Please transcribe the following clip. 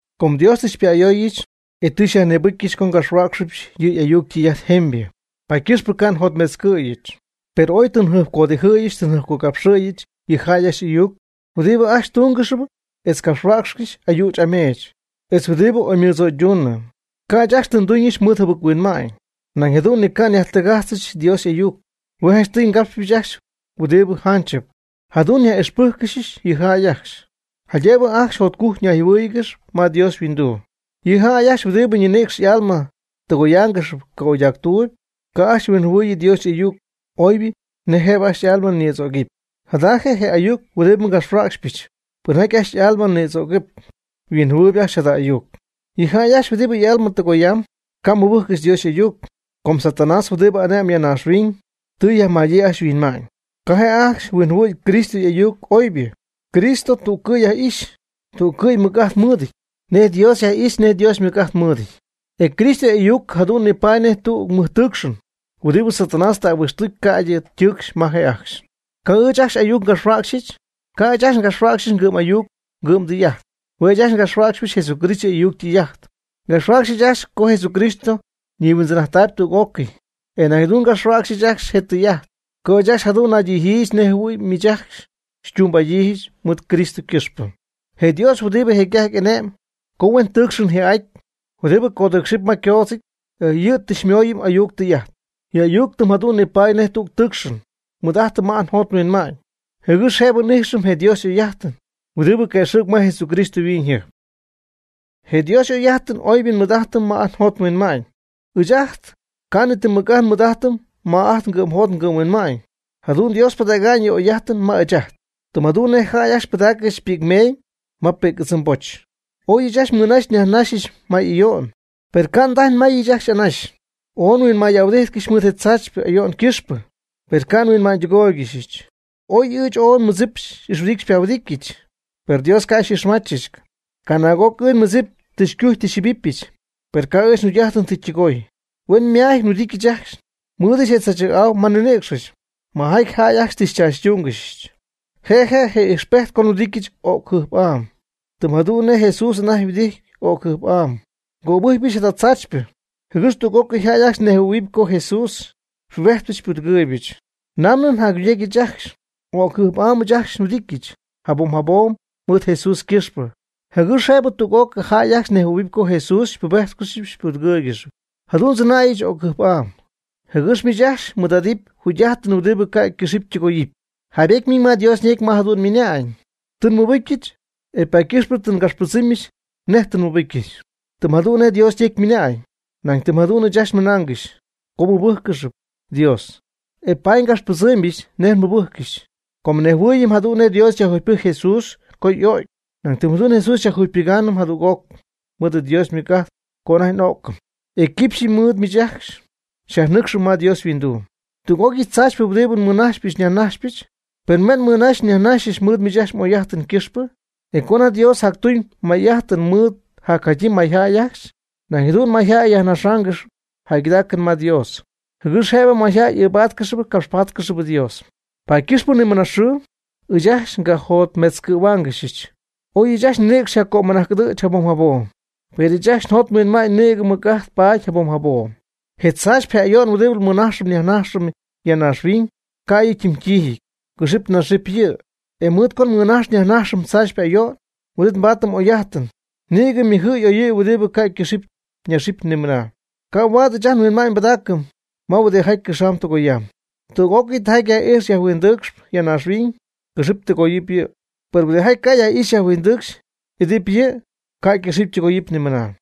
Com Dios tɨ xypa'ayooyɨch, e tɨ xyajnïbɨcyɨch co ngapxhuäcxɨbɨch yɨ' y'ayuc ytɨy'ajt jemybɨ, paady ycɨxp ca' njotmetzcɨ̈yɨch. Per ooy tɨ njɨjpcodijɨ́ɨygɨxyɨch tɨ njɨjpcogapxɨ́ɨygɨxyɨch yɨ jäy ajcxy y'ayuc huɨdibɨ ajcxy ytungɨxyp etz ycapxcɨxpy ayüch ameech, etz huɨdibɨ oymɨdzöyduunɨ. Ca' ɨɨch ajcxy ti nduñɨch mɨɨd jɨbɨc-huinma'ñ. Nañ jadu'n ni ca' nyajtɨgájtzcɨxɨch Dios y'ayuc. Hue' janchtɨy ngapxpɨch ajcxy huɨdibɨ janchɨp. Jadu'n nyaj'ixpɨ́jccɨxyɨch yɨ jäy ajcxy, jaydëbɨ ajcxy jotcujc ñayjɨhuɨ́ɨyɨgɨxy ma Dios yhuinduu. Yɨ jäy ajcxy huɨdibɨ nɨcxy y'alma ytɨgoyaangɨxy ca'oydactuuby, ca' ajcxy huinjɨhuɨ̈y Dios y'ayuc oybɨ nej jëbɨ ajcxy y'alma nïdzögɨpy. Jada je' je ayuc huɨdibɨ ngapxhuäcxcɨxpɨch. Pɨnjaty ajcxy y'alma nïdzögɨp yhuinjɨhuɨɨyb ajcxy jada ayuc. Yɨ' ajcxy huɨdibɨ y'alma tɨgoyaanɨp ca' mɨbɨjccɨxy Dios y'ayuc, com Satanás huɨdibɨ ane'mb ya naaxhuiñ tɨ yajmädyii ajcxy yhuinma'ñ. Ca' je' ajcxy huinjɨhuɨ̈y Cristo y'ayuc oybɨ. Cristo tú'cɨy yaj'ixy, tú'cɨy mɨc'ajt mɨɨdɨty, nej Dios yaj'ixy nej Dios mɨc'ajt mɨɨdɨty. E Cristo y'ayuc jadu'n nipaady nej tüg mɨjtɨcxɨn huɨdibɨ Satanás tɨ ahuijtztucy ca'ydɨ ytɨcxy ma je' ajcxy. Co ɨɨch ajcxy ayuc ngapxhuäcxyɨch, ca' ɨɨch ajcxy ngapxhuäcxy ngɨ'm'ayuc ngɨ'mdɨy'ajt. Hue' ɨɨch ajcxy ngapxhuäcxyp Jesucristo y'ayuc ytɨy'ajt. Ngapxhuäcxyɨch ajcxy co Jesucristo ñihuindzɨn'ajttaayb tüg'ócɨy. E nañ jadu'n ngapxhuäcxyɨch ajcxy je tɨy'ajt co ɨɨch ajcxy jadu'n naydijɨɨygɨxyɨch nej jɨhuɨ̈y miich ajcxy xytumbɨ'adyii mɨɨd Cristo ycɨxpɨ. Je Dios huɨdibɨ jecy'ajty ane'm co huen tɨɨcxɨn ji'aty huɨdibɨ codɨɨcxɨp ma ycoodzɨty, yɨ' tɨ xymooyɨm y'ayuc ytɨy'ajt. Yɨ' y'ayuc tɨm jadu'n nipaady nej tüg tɨɨcxɨn nmɨɨd'ajtɨm ma ajt njot nhuinma'ñ, jɨgɨx jëbɨ n'ijxɨm je Dios y'oy'ajtɨn huɨdibɨ quëxɨ̈cp ma Jesucristo yhuiñyjɨjp. Je Dios y'oy'ajtɨn oybɨ nmɨɨd'ajtɨm ma ajt njot nhuinma'ñ, ɨɨch ajt ca' ni ti mɨc'ajt nmɨɨd'ajtɨm ma ajt ngɨ'mjot ngɨ'mhuinma'ñ. Jadu'n Dios pɨdägyñɨ yɨ' y'oy'ajtɨn ma ɨɨch ajt, tɨm jadu'n nej jäy ajcxy pɨdaaccɨxy pi'cmeeñ ma pi'c'ɨdzɨmboch. Oy ɨɨch ajcxy nmɨnaxyɨch nyajnaxyɨch may ayo'n, per ca' ndajy nmayɨch ajcxy anaxy. Ooy nhuinmay'ahuɨdíjtcɨxyɨch mɨɨd je tzaachypɨ ayo'n ycɨxpɨ, per ca' nhuinma'ñydɨgóoygɨxyɨch. Oy ɨɨch ooy nmɨdzip xy'ixhuɨdityɨch xypahuɨdityɨch, per Dios ca' xy'ixmachɨch. Canaag'oc ɨɨch nmɨdzip tɨ xycujy tɨ xyjɨbipyɨch. Per ca' ɨɨch njugy'ajtɨn tɨ ytɨgooy. Hueñyma'amyɨty nhuɨdityɨch ajcxy nmɨɨdɨch je tzaachɨ̈'au ma nninïcxɨch, ma jäy ajcxy tɨ xychaachytúungɨxɨch. Je' je' je ijxpejt co nhuɨdityɨch o'cɨn jɨjp'am, tɨm jadu'n nej Jesús anajty huɨdity o'cɨn jɨjp'am. Ngöbɨjcypɨch jada tzaachypɨ, jɨgɨx tüg'ócɨy jäy ajcxy nejhuɨ̈huɨp co Jesús xypubejtpɨch xypudɨgɨɨybɨch. Namɨ jacjugy'ajtnɨch ajcxy, o'cjɨjp'am ɨɨch ajcxy nhuɨdijtcɨxy jabom jabom mɨɨd Jesús ycɨxpɨ, jɨgɨx jëbɨ tüg'ócɨy jäy ajcxy nejhuɨ̈huɨpy co Jesús xypubejtcɨxyp xypudɨgɨɨygɨxyp. Jadu'n ndzɨnäyɨch o'cjɨjp'am, jɨgɨx miich ajcxy mɨɨd'adɨp jugy'ajtɨn huɨdibɨ ca' ycɨxɨpy ytɨgoyɨpy. Jaybety ymiñ ma Dios ñecy ma jadu'n ymɨna'ñ: “Tɨ nmɨbɨcyɨch, e paady ycɨxpɨ tɨ ngapxpɨdzɨmybɨch nej tɨ nmɨbɨcyɨch.” Tɨm jadu'n nej Dios ñecy ymɨna'ñ, nañ tɨm jadu'n ɨɨch ajcxy ymɨnaangɨxy co nmɨbɨ́jccɨxyɨch Dios, e paady ngapxpɨdzɨ́mgɨxyɨch nej nmɨbɨ́jccɨxyɨch. Com nejhuɨɨyɨm jadu'n nej Dios yajjugypɨjcy Jesús co y'o'cy. Nañ tɨm jadu'n Jesús xyajjugypɨgaanɨm jadüg'oc mɨɨd Dios ymɨc'ajt co anajty n'o'cɨm. E quipxyɨ mɨɨd miich ajcxy xyajnɨ́cxɨmɨp ma Dios yhuinduu. Tüg'ócɨy tzaachypɨ huɨdibɨ nmɨnajxypɨch nyajnajxypɨch, hue' nmɨnaxyɨch nyajnaxyɨch mɨɨd miich ajcxy m'oy'ajtɨn ycɨxpɨ. E co anajty Dios jactuñ may'ajtɨn mɨɨd jacjadyii mayjäy ajcxy, nañ jadu'n mayjäy yajnájxcɨxɨpy jäygɨdaacɨn ma Dios, jɨgɨx jëbɨ mayjäy ɨɨbáatcɨxɨpy capxpáatcɨxɨpy Dios. Paady ycɨxpɨ ni mɨna xɨɨ, ɨɨch ajcxy ngajotmetzcɨ̈huaangɨxy. Oy ɨɨch ajcxy nninïcx yjaccömɨnajc'ɨdɨ̈ch jabom jabom, per ɨɨch ajcxy njot nhuinma'ñ nïgɨ mɨc'ajt paady jabom jabom. Je tzaachypɨ je ayo'n huɨdibɨ nmɨnajxɨm nyajnajxɨm ya naaxhuiñ, ca' yɨ' ytimytiijɨty. Cɨxɨp naxɨp yɨ'. E mɨɨd co nmɨnajxɨm nyajnajxɨm tzaachypɨ ayo'n, huin'it nbaatɨm oy'ajtɨn nïgɨ ymɨjɨty y'oyɨty huɨdibɨ ca' ycɨxɨpy ñaxɨpy ni mɨna. Ca' huaad ɨɨch ajt nhuinma'ñ nbɨdaacɨm ma huɨdijaty cɨxamb tɨgoyamb. Tüg'ócɨy tijaty yaj'ijxp yajhuindɨɨcxp ya naaxhuiñ, cɨxɨ́p tɨgoyɨ́p yɨ'. Per huɨdijaty ca' yaj'ixy yajhuindɨcxy, idɨ́p yɨ', ca' ycɨxɨ́py ytɨgoyɨ́py nimɨna.